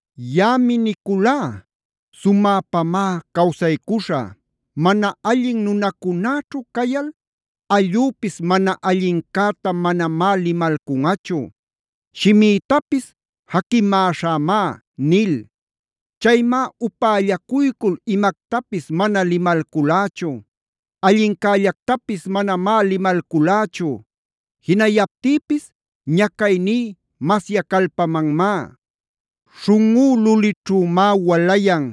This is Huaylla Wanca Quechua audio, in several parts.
Yaꞌami niculá: “Sumäpamá cawsaycuśhä; mana allin nunacunäćhu cayal allüpis mana allincäta manamá limalcunꞌachu; shimïtapis jaquimäśhämá” nil. Chaymá upällacuycul imactapis mana limalculächu. Allincällactapis manamá limalculächu. Jinayaptïpis ñacayní masyacalpamanmá. Śhunꞌú lulićhümá walayan.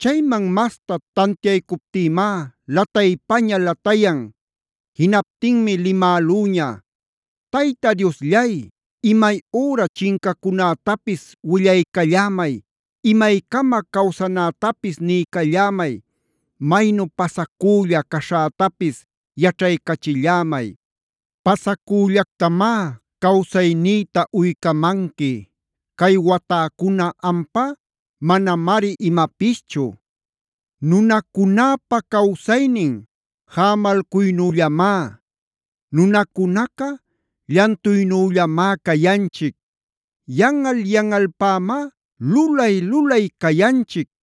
Chayman masta tantiaycuptïmá lataypaña latayan. Jinaptinmi limälüña: “Tayta Diosllay, imay üra chincacunätapis willaycallämay, imaycama cawsanätapis niycallämay. Maynu pasacülla caśhätapis yaćhaycachillämay. Pasacüllactamá cawsaynïta uycamanqui. Cay watäcuna, ampá manamari imapischu. ¡Nunacunäpa cawsaynin jämalcuynüllamá! Nunacunaca llantuynüllamá cayanchic. Yanꞌal-yanꞌalpämá lulay-lulay cayanchic,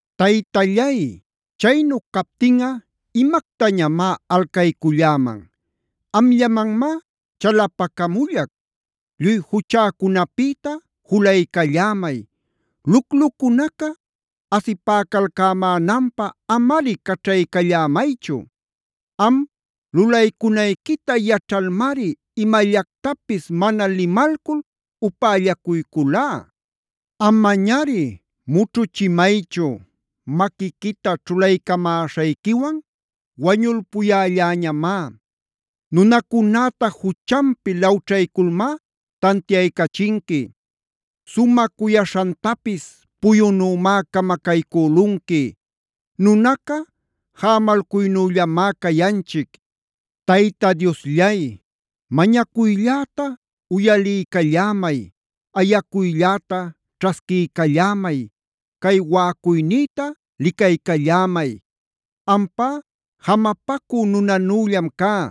“Taytallay, chaynu captinꞌa ¿imactañam alcayculläman? Amllamanmá chalapacamullac. Lluy juchäcunapïta julaycallämay. Luclucunaca asipäcalcämänanpä amari caćhaycallämaychu. Am lulaycunayquita yaćhalmari imallactapis mana limalcul upällacuyculá. Amañari mućhuchimaychu. Maquiquita ćhulaycamäśhayquiwan wañulpuyälläñamá. Nunacunäta juchanpi lawćhayculmá tantiaycachinqui. Sumä cuyaśhantapis puyunümá camacaycülunqui. Nunaca jämalcuynüllamá cayanchic. “Tayta Diosllay, mañacuylläta uyaliycallämay, ayacuylläta ćhasquiycallämay, cay waꞌacuynïta licaycallämay. Ampá jamapacü nunanüllam cá.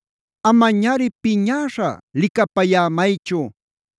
Amañari piñäśha licapayämaychu.